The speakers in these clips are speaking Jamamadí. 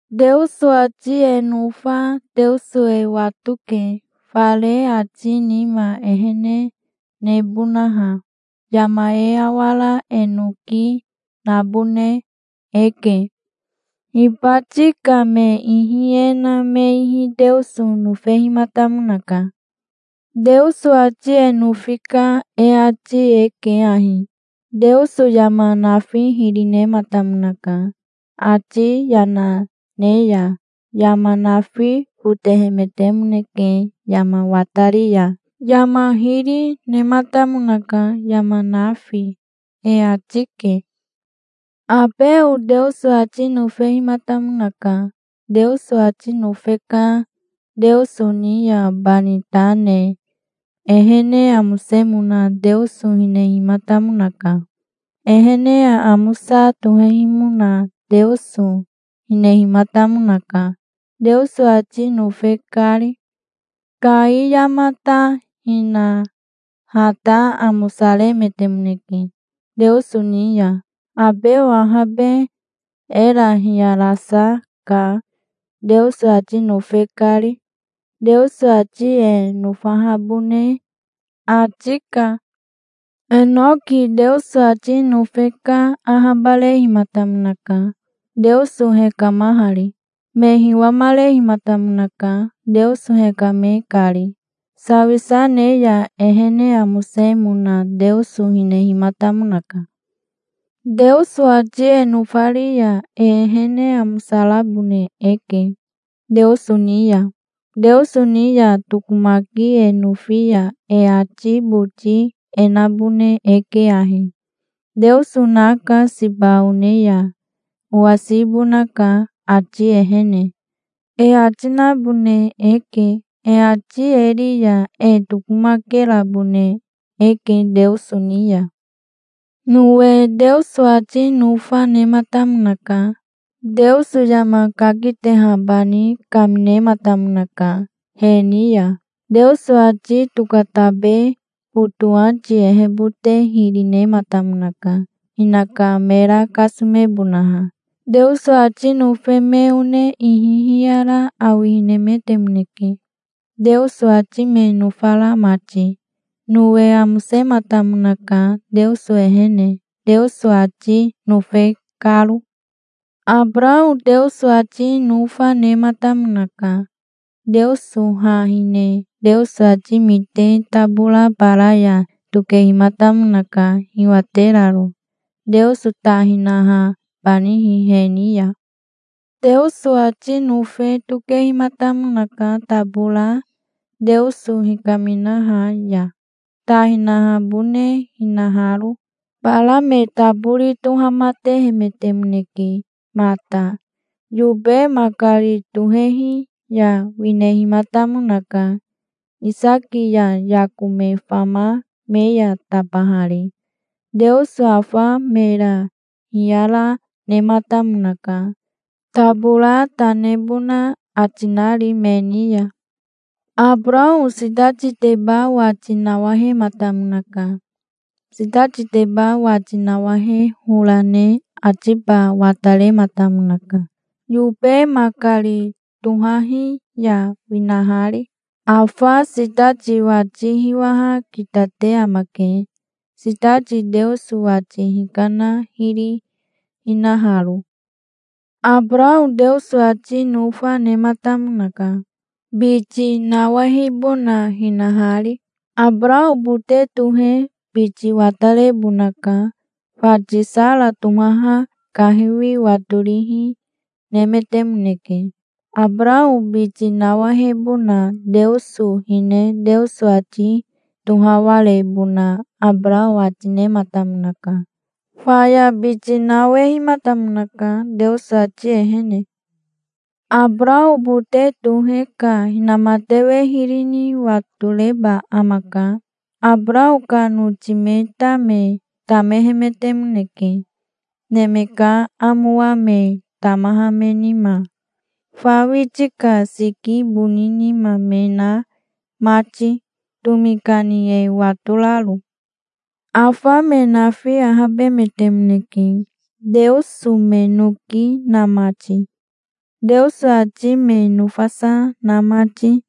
Teoso ati e nofa Teoso e watoke, fare ati nima ehene nebonaha. Yama e awara e noki nabone eke. Hibati ka me ihi e na me ihi Teoso nofehimatamonaka. Teoso ati e nofi ka e ati e ke ahi: Teoso yama nafi hiri nematamonaka. Ati yana ne ya yama nafi fotohemetemoneke. Yama watari ya yama hiri nematamonaka, yama nafi, e ati ke. Abeo Teoso ati nofehimatamonaka. Teoso ati nofe ka Teoso ni ya bani ta ne ehene amosemona Teoso hinehimatamonaka. Ehene aamosa tohehimona Teoso hinehimatamonaka, Teoso ati nofe kari. Kai yama ta hina ha ta amosaremetemoneke Teoso ni ya. Abeo ahabe era hiyarasa ka, Teoso ati nofe kari. Teoso ati e nofahabone ati ka. Enoki Teoso ati nofe ka ahabarehimatamonaka, Teoso hekamahari. Me hiwamarehimatamonaka, Teoso hekame kari. Sawisa ne ya ehene amosemona Teoso hinehimatamonaka. Teoso ati e nofari ya e ehene amosarabone eke Teoso ni ya. Teoso ni ya tokomaki e nofi ya e ati boti e nabone eke ahi: "Teoso naka. Siba one ya owasibonaka, ati ehene", e ati nabone eke. E ati e ri ya e tokomakerabone eke Teoso ni ya. Nowe Teoso ati nofa nematamonaka. Teoso yama kaketehabani kaminematamonaka he ni ya. Teoso ati tokatabe fotowati ehebote hiri nematamonaka, hinaka mera kasomebonaha. Teoso ati nofe me one ihi hiyara awihinemetemoneke, Teoso ati me nofara mati. Nowe amosematamonaka Teoso ehene, Teoso ati nofe karo. Abarao Teoso ati nofa nematamonaka. Teoso ha hine Teoso ati mite tabora bara ya tokehimatamonaka, hiwateraro, Teoso ta hinahabanihi he ni ya. Teoso ati nofe tokehimatamonaka tabora Teoso hikaminaha ya, ta hinahabone hinaharo. Bara me tabori tohamatehemetemoneke mata. Yobe makari tohehi ya winehimatamonaka, Isaki ya Yako me fama me ya tabahari. Teoso afa mera hiyara nematamonaka, tabora ta nebona ati nari me ni ya. Abarao sitatiteba wati nawahematamonaka. Sitatiteba wati nawahe hora ne atiba watarematamonaka, yobe makari tohahi ya winahari. Afa sitati wati hiwaha kitate amake, sitati Teoso wati hikana hiri hinaharo. Abarao Teoso ati nofa nematamonaka, biti nawehibona hinahari. Abarao bote tohe biti watarebonaka. Fati Sara tohaha kahiwi watorihi nemetemoneke. Abarao biti nawehibona Teoso hine Teoso ati tohawarebona Abarao ati nematamonaka. Faya biti nawehimatamonaka Teoso ati ehene. Abarao bote tohe ka inamatewe hiri ni watoreba amaka. Abarao ka noti me ta me tamehemetemoneke, neme ka amowa me tamaha me nima, fa witi ka siki boni nima me na mati, tomi kani e watoraro. Afa me nafi ahabemetemoneke, Teoso me noki na mati, Teoso ati me nofasa na mati,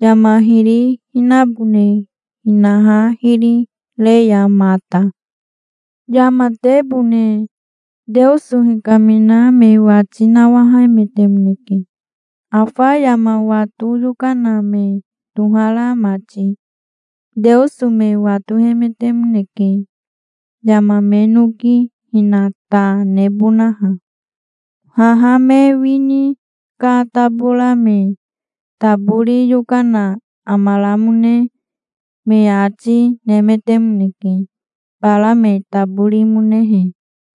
yama hiri hinabone hinaha hiri re ya mata. Yamatebone Teoso hikamina me wati nawahemetemoneke, afa yama wato yokana me tohara mati. Teoso me watohemetemoneke, yama me noki hina ta nebonaha. Haha me wini ka tabora me tabori yokana amaramone me ati nemetemoneke, bara me taborimonehe.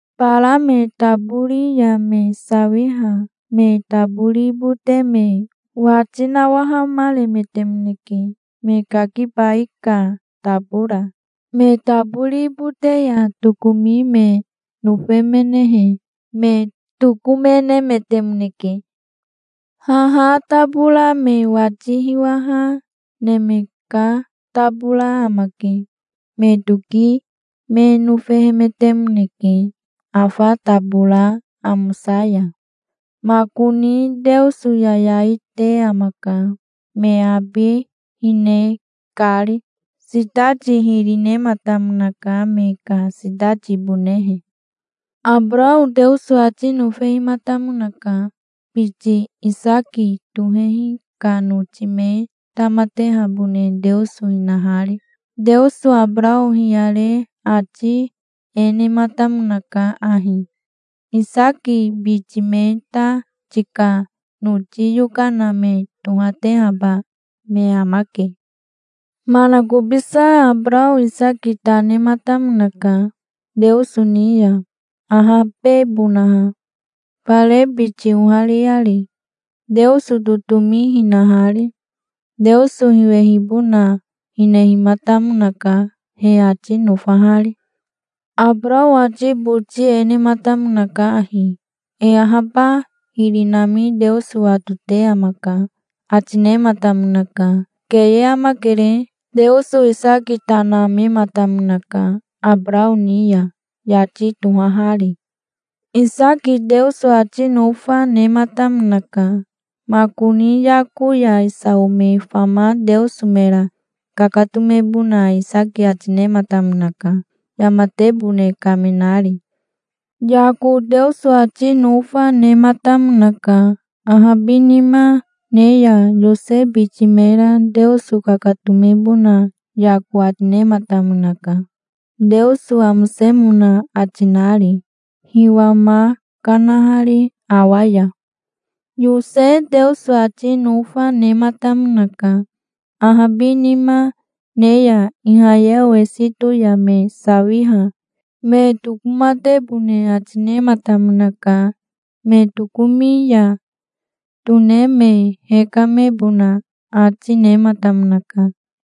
Bara me tabori ya me sawiha me tabori bote me wati nawahamaremetemoneke, me kakibai ka tabora. Me tabori bote ya tokomi me nofemenehe me tokomenemetemoneke. Haha tabora me wati hiwaha neme ka tabora amake. Me toki me nofehemetemoneke afa tabora amosa ya. Makoni Teoso yayai te amaka, me abi hine kari. Sitati hiri nematamonaka, me ka sitatibonehe. Abarao Teoso ati nofehimatamonaka, biti Isaki tohehi ka noti me tamatehabone Teoso hinahari. Teoso Abarao hiyare ati e nematamonaka ahi: "Isaki biti me ta tika noti yokana me tohatehaba me amake". Manakobisa Abarao Isaki ta nematamonaka Teoso ni ya, ahabebonaha, fare biti ohariari, Teoso totomi hinahari. Teoso hiwehibona hinehimatamonaka he ati nofahari. Abarao ati boti e nematamonaka ahi: "E ahaba hiri nami Teoso watote amaka", ati nematamonaka. Keye amakere. Teoso Isaki ta namematamonaka Abarao ni ya, yati tohahari. Isaki Teoso ati nofa nematamonaka. Makoni Yako ya Isao me fama Teoso mera kakatomebona Isaki ati nematamonaka, yamatebone kaminari. Yako Teoso ati nofa nematamonaka. Ahabinima ne ya Yose biti mera Teoso kakatomebona Yako ati nematamonaka, Teoso amosemona ati nari, hiwa ma kanahari awa ya. Yose Teoso ati nofa nematamonaka. Ahabinima ne ya Ihayeo Esito ya me sawiha me tokomatebone ati nematamonaka. Me tokomi ya tone me hekamebona ati nematamonaka,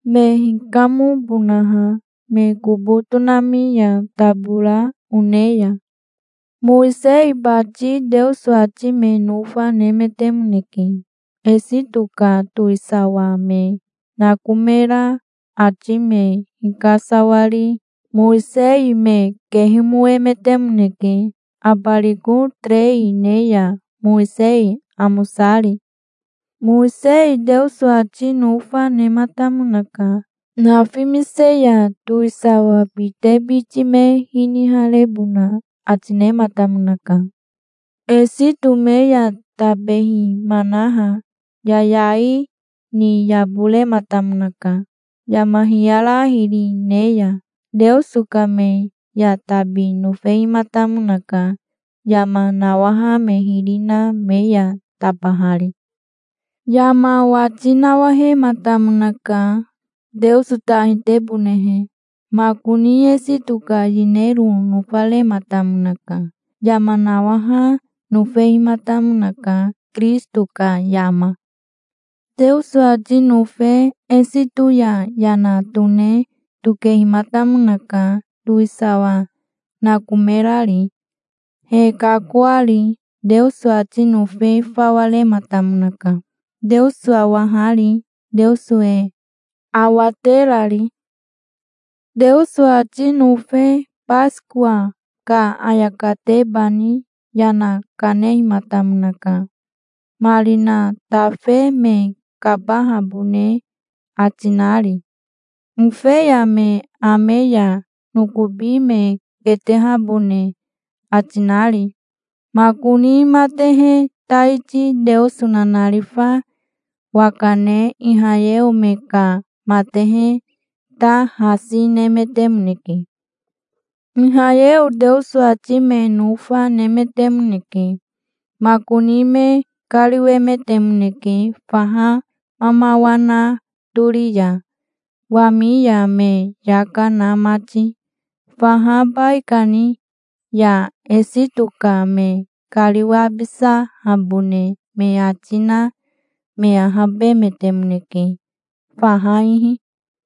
me hikamobonaha me kobo tonami ya tabora one ya. Mowisei bati Teoso ati me nofa nemetemoneke. Esito ka towisawa me nakomera ati me hikasawari Mowisei me kehemoemetemoneke, abariko terei ne ya, Mowisei amosari. Mowisei Teoso ati nofa nematamonaka. Nafimise ya towisawa bite biti me hiniharebona ati nematamonaka. Esito me ya tabehimanaha, yayai ni yaborenamatamonaka, yama hiyara hiri ne ya. Teoso ka me ya tabi nofehimatamonaka, yama nawaha me hiri na me ya tabahari. Yama wati nawahematamonaka, Teoso ta hitebonehe. Makoni Esito ka yinero nofarematamonaka. Yama nawaha nofehimatamonaka, Kirisito ka yama. Teoso ati nofe Esito ya yana tone tokehimatamonaka, towisawa nakomerari, he kakoari. Teoso ati nofi fawa rematamonaka, Teoso awahari, Teoso e awaterari. Teoso ati nofe Basikowa ka ayakatebani yana kanehimatamonaka, marina tafe me kabahabone ati nari, ofeya me ame ya nokobi me ketehabone ati nari. Makoni matehe taiti Teoso nanarifa waka ne Ihayeo me ka matehe ta hasi nemetemoneke. Ihayeo Teoso ati me nofa nemetemoneke. Makoni me kariwemetemoneke faha mamawa na tori ya, wami ya me yaka na mati faha baikani ya. Esito ka me kariwabisahabone me ati na me ahabemetemoneke faha ihi.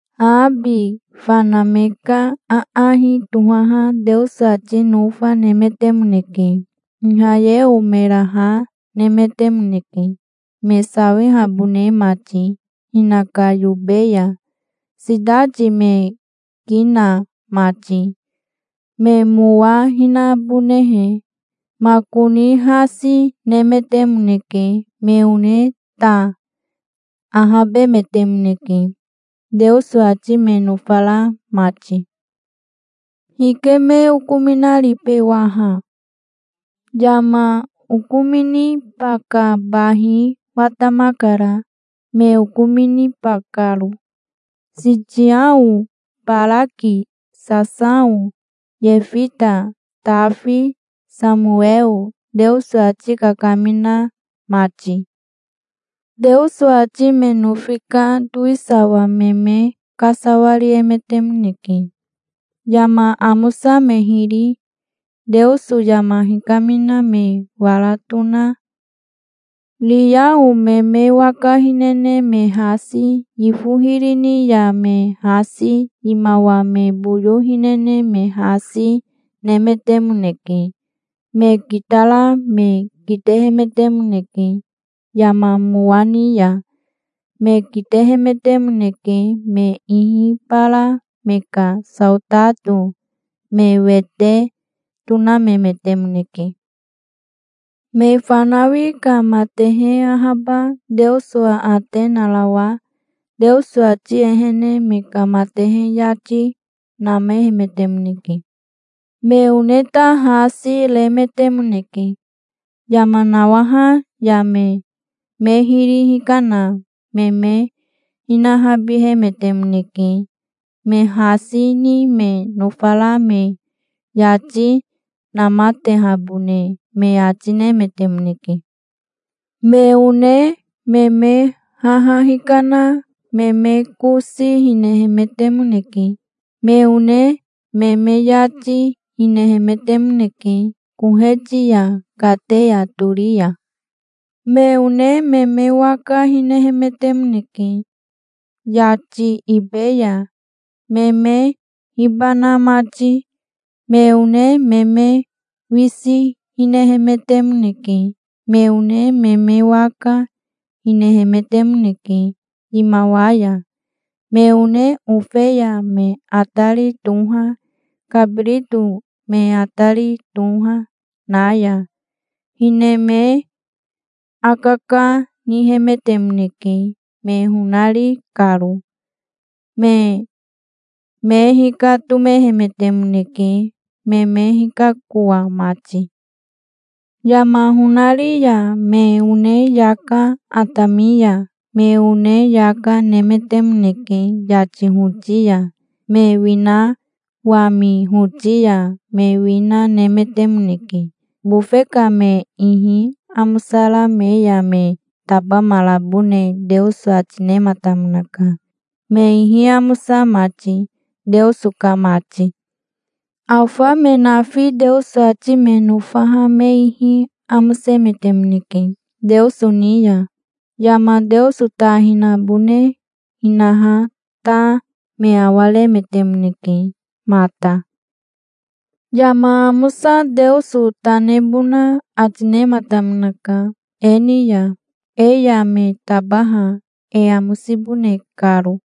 Haabi fana me ka aahi tohaha Teoso ati nofa nemetemoneke. Ihayeo mera ha nemetemoneke, me sawihabone mati hinaka yobe ya, sitati me ki na mati, me mowa hinabonehe. Makoni hasi nemetemoneke. Me one ta ahabemetemoneke, Teoso ati me nofara mati. Hike me okominaribe waha? Yama okominiba ka bahi watamakara, me okominiba karo, Sitiao, Baraki, Sasao, Yefita, Tafi, Samoweo, Teoso ati kakamina mati. Teoso ati me nofi ka towisawa me me kasawariemetemoneke. Yama amosa me hiri, Teoso yama hikamina me wara tona, riao me me waka hinene me hasi, yifo hiri ni ya me hasi, yimawa me boyo hinene me hasi, nemetemoneke. Me kitara me kitehemetemoneke. Yama mowa ni ya me kitehemetemoneke. Me ihi bara me ka saotato me wete tonamemetemoneke. Me fanawi ka matehe ahaba Teoso aate narawa Teoso ati ehene me ka matehe yati namehemetemoneke. Me one ta hasi remetemoneke. Yama nawaha ya me me hiri hikana me me hinahabihemetemoneke. Me hasi ni me nofara me yati namatehabone me ati nemetemoneke. Me one me me haha hikana, me me kosi hinehemetemoneke. Me one me me yati hinehemetemoneke koheti ya, kateya tori ya. Me one me me waka hinehemetemoneke, yati ibe ya me me hibana mati. Me one me me wisi hinehemetemoneke. Me one me me waka hinehemetemoneke yimawa ya. Me one ofeya me atari toha, kabirito me atari toha, na ya hine me akaka nihemetemoneke, me honari karo. Me me hikatomehemetemoneke, me me hikakoa mati. Yama honari ya me one yaka, atami ya me one yaka, nemetemoneke. Yati hoti ya me wina, wami hoti ya me wina nemetemoneke. Bofe ka me ihi amosara me ya me tabamarabone Teoso ati nematamonaka, me ihi amosa mati, Teoso ka mati. Afa me nafi Teoso ati me nofaha me ihi amosemetemoneke Teoso ni ya. Yama Teoso ta hinabone hinaha ta me awaremetemoneke mata. Yama amosa Teoso ta nebona ati nematamonaka e ni ya, e ya me tabaha e amosibone karo.